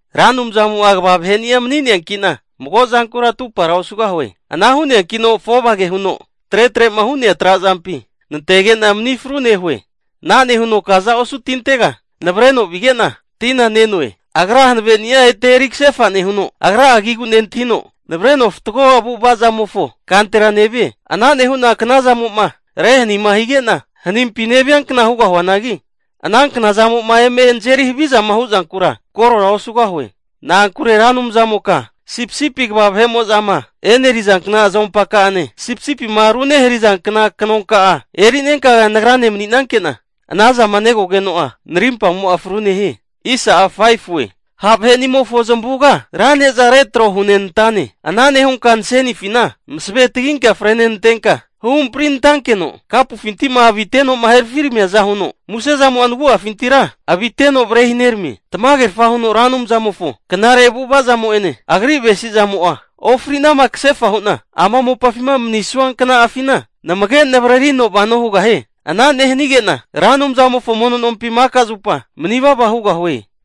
Ra Anumzamo'a kva vaheni'a mani'neanki'na, mago zankura atupara osugahue. Ana hu'neankino afovage huno tretre'ma hu'nea trazampi nantege'na mani fru nehue. Ana nehuno kaza osu tintega navareno vige'na, tina ne'noe. Agra hanaveni'a ete eri kasefa nehuno, Agra'a agigu nentahino navareno fatgo avu'avazamofo kantera nevie. Ana nehu'na knazamo'ma rehanima hige'na, hanimpi neviankna hugahuanagi, anankna zamo'ma eme nazeri havizama hu'zankura korora osugahue. Na'ankure Ra Anumzamoka sipisipi kva vahe'mo'zama e'nerizankna azompaka'ane, sipisipima runeharizankna knonka'a eri'nenka nagrane mani'nanke'na ana zama negogeno'a, narimpamo'a fru nehie. Ha' vahe'nimofo zamavuga, ra ne'zana retro hunenantane. Ana nehunka nasenifina masave taginka fre nenantenka, huhampri nantankeno, kapufinti'ma avite'noma herafiramiaza huno musezamo'a nagu'afintira aviteno varehineramie. Tamagerfa huno Ra Anumzamofo knare avu'ava zamo'ene agri avesi'zamo'a ofri'nama kasefa hu'na ama mopafima manisua kna'afina, namage navararino vano hugahie. Ana nehanige'na Ra Anumzamofo mono nompi maka zupa manivava hugahue.